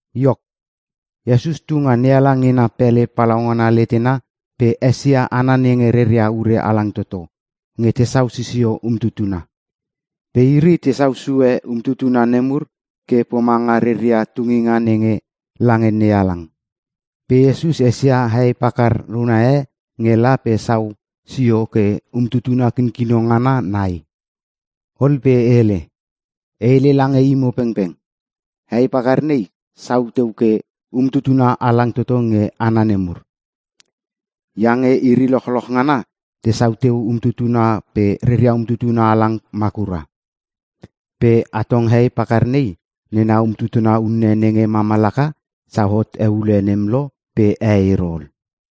Iok, Iesus tu nga NeHalang nena pele palaungana letena pe esia hana nenge reria ure halang toto nge tesau sisio umtutuna. Pe iri tesau sue umtutuna nemur ke pomanga reria tunginga nenge lange NeHalang. Pe Iesus esia hei pakar una e nge la pe sau sio ke umtutuna kinkino ngana nai. Ol pe hele, “E hele lange imo pengpeng. Hei pakar nei, sau teu ke umtutuna halang toto nge hana nemur. Iange iri lochloch ngana tesau teu umtutuna pe reria umtutuna halang makura. Pe atong hei pakar nei, nena umtutuna unne nenge mama laka sau hot eule nem lo pe e ero ol.”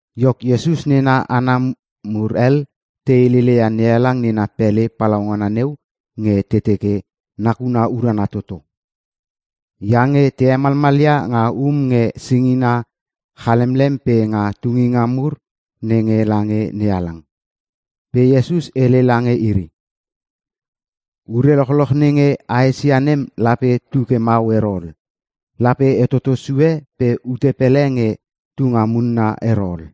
Iok, Iesus nena hana mur hel te heleleia NeHalang nena pele palaungana neu nge te teke nakuna urana toto. Iange te hemalmalia nga um nge singina chalemlem pe nga tunginga mur nenge lange NeHalang. Pe Iesus hele lange iri, “Ure lochloch nenge a esia nem lape tuke mau ero ol. Lape tetoto sue pe ute pele nge tunga munna ero ol.”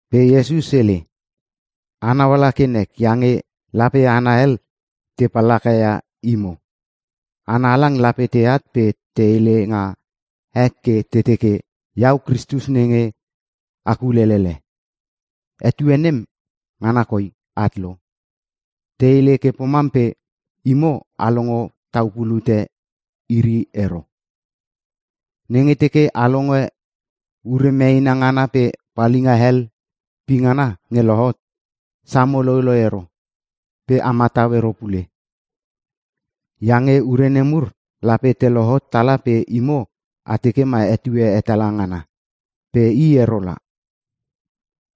Pe Iesus hele, “Anau ala ke nek iange lape hana hel te pallakaia imo. Hana halang lape teat pe te hele nga ek ke te teke, ‘Iau Kristus nenge a kulelele! Etue nem, ngana koi at lo.’ Te hele ke pomam pe imo a longo tau pulute iri ero! Nenge teke a longe ure meena ngana pe palinga hel pingana nge lohot, samo loiloi ero pe a matau ero pule. Iange ure nemur lape te lohot tala pe imo a teke ma etue hetala ngana. Pe i ero la.”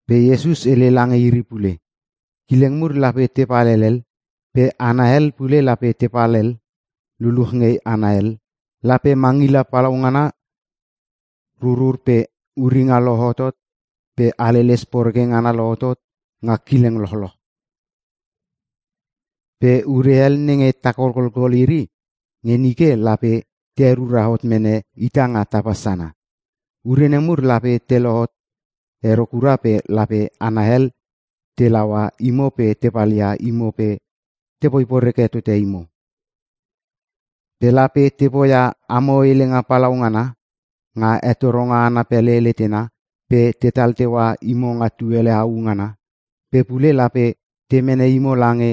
Pe Iesus hele lange iri pule, “Kileng mur lape tepal helel pe hana hel pule lape tepal hel luluch nge hana hel. Lape mangila palaungana rurur pe uringa lohotot pe haleles poreke ngana lohot nga kileng lochloch. Pe ure hel nenge ta kolkolkol iri nge nike lape te herura hot mene ita nga tapa sana. “Ure nemur lape te lohot ero kura pe lape hana hel te laua imo pe te palia imo pe tepoi poreke tote imo. Pe lape te poia amo helenga palaungana nga hetoronga ana pele letena pe tetal teua imo nga tuele au ngana. Pe pule lape te mene imo lange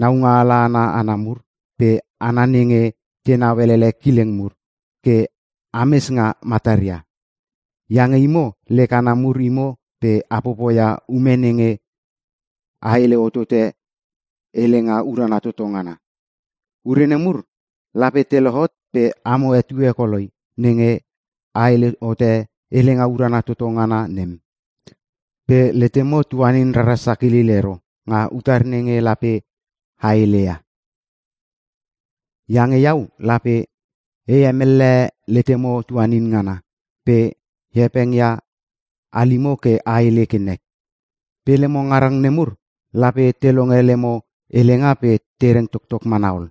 naungaala ana hana mur pe hana nenge tenau elele kileng mur ke ames nga mataria. Iange imo lek hana mur imo pe a popoia ume nenge a hele hotote Helenga Urana Toto Ngana. Ure nemur lape te lohot pe amo etue koloi nenge a hele hote Helenga Urana Toto Ngana nem. Pe letemo tuanin rara sakilil ero nga utar nenge lape a heleia. Iange iau lape e hemellehe letemo tuanin ngana pe e hepeng ia halimo ke a hele ke nek. Pe lemo ngarang nemur lape te longe lemo helenga pe te reng toktok mana ol.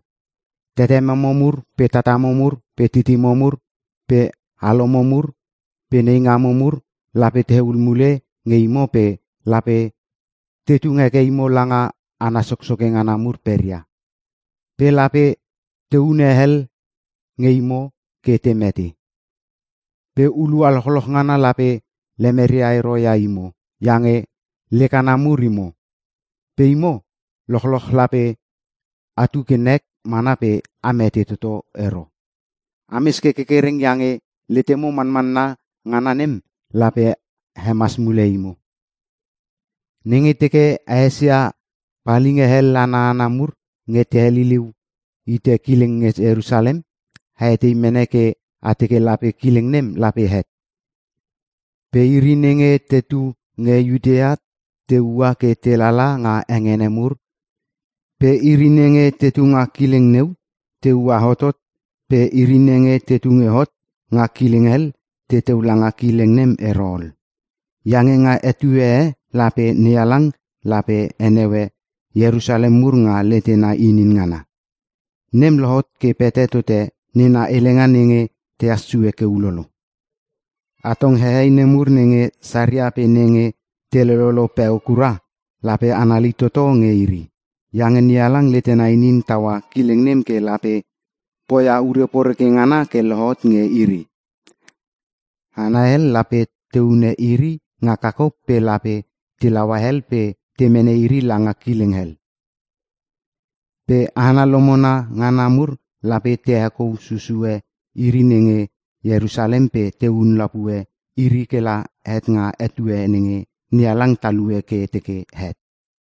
Tetememo mur pe tatamo mur pe titimo mur pe alomo mur pe neingamo mur, lape tehul mule nge imo pe lape te tung heke imo langa hana soksoke ngana mur peria. Pe lape te hune hel nge imo ke te mete. Pe hulua lochloch ngana lape lemeria ero ia imo iange lek hana mur imo. Pe imo lochloch lape atu ke nek mana pe a mete toto ero. Ames ke kerkereng iange letemo manmanna ngana nem lape hemas mule imo. “Nenge teke a esia palinga hel ana hana mur nge te heliliu hite kileng nge Ierusalem, a etei mene ke a teke lape kileng nem lape het. Pe iri nenge tetu nge Iutea te ua ke telala nga hengene mur pe iri nenge te tunga kileng neu te ua hotot pe iri nenge tetu nge hot nga kileng hel teteu langa kileng nem ero ol. Iange nga etue e lape NeHalang lape heneue Ierusalem mur nga letena inin ngana. Nem lohot ke pete tote nena helenga nenge tehas sue ke ulolo. Atong hehei nemur nenge saria pe nenge te lololo peo kura, lape anali toto nge iri. Iange NeHalang letena inin taua kileng nem ke lape poia ure poreke ngana ke lohot nge iri. Hana hel lape te hune iri nga kakop pe lape te laua hel pe te mene iri langa kileng hel. Pe hana lomona ngana mur lape te hekou susue iri nenge Ierusalem pe tehun lapue iri kela het nga etue nenge NeHalang talue ke teke het.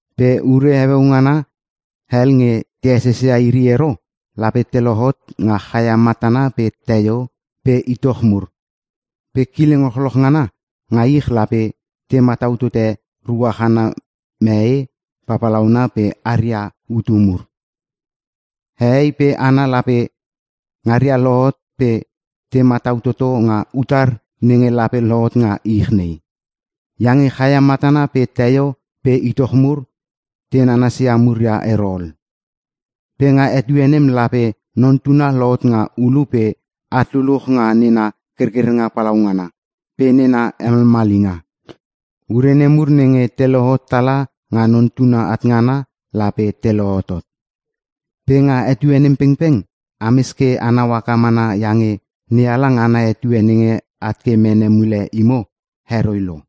“Pe ure heueu ngana hel nge te esesia iri ero, lape te lohot nga chaia matana pe teio pe itoch mur. Pe kileng lochloch ngana nga ich lape te matau tote ruach ana mee papalauna pe aria hutu mur. Hehei pe hana lape ngaria lohot pe te matau toto nga utar nenge lape lohot nga ich nei. Iange chaia matana pe teio pe itoch mur te nanasia muria ero ol. Pe nga etue nem lape Non Tuna lohot nga ulu pe at luluch nga nena kerkerenga palaungana pe nena hemalmalinga. Ure nemur nenge te lohot tala nga Non Tuna at ngana, lape te lohotot. Pe nga etue nem pengpeng ames ke anau haka mana iange NeHalang ana etue nenge at ke mene mule imo, heroi lo.”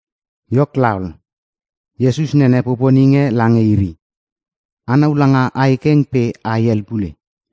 Iok laol, Iesus nene poponing e lange iri, “Anau langa ae keng pe ae hel pule.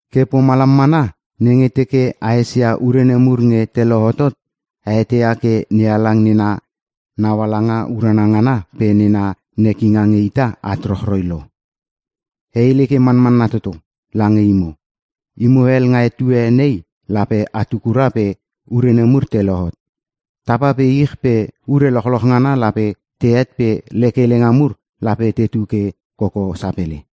Ke pomalam mana nenge teke a esia ure nemur nge te lohotot, a eteia ke NeHalang nena naualanga urana ngana pe nena nekinga nge ita at rochroi lo. “E hele ke manmanna toto lange imo. Imo hel nga etue nei lape atu kura pe ure nemur te lohot. Tapa pe ich pe ure lochloch ngana lape tehet pe lek helenga mur lape tetu ke koko sapele.”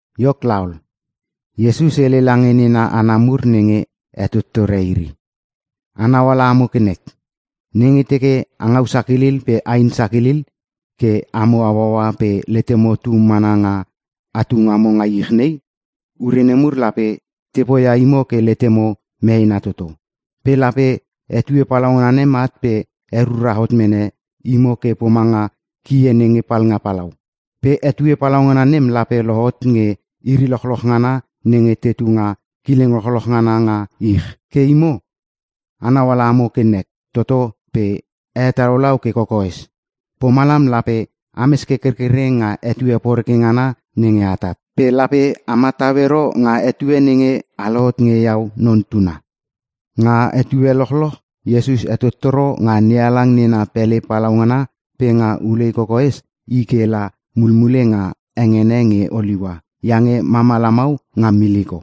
Iok laol, Iesus hele lange nena hana mur nenge hetottore iri, “Anau ala amo ke nek, nenge teke a ngau sakilil pe ain sakilil ke amo hauaua pe letemo tu mana nga atu ngamo nga ich nei, ure nemur lape te poia imo ke letemo meena toto. Pe lape etue palaungana nem at pe herura hot mene imo ke pomanga kie nenge palnga palau. Pe etue palaungana nem lape lohot nge iri lochloch ngana nenge tetu nga kileng lochloch ngana nga ich. Ke imo a nauala amo ke nek toto pe a hetalaulau ke kokoes. Pomalam lape ames ke kerkereng nga etue poreke ngana nenge atat. Pe lape a matau ero nga etue nenge a lohot nge iau Non Tuna.” Nga etue lochloch Iesus hetottoro nga NeHalang nena pele palaungana pe nga ulei kokoes, i ke la mulmule nga hengene nge Oliua iange mama lamau nga miliko.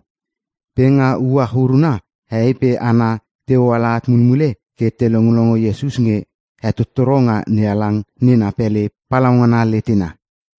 Pe nga uach uruna hehei pe hana te hoala at mulmule ke te longlongo Iesus nge hetottoro nga NeHalang nena pele palaungana letena.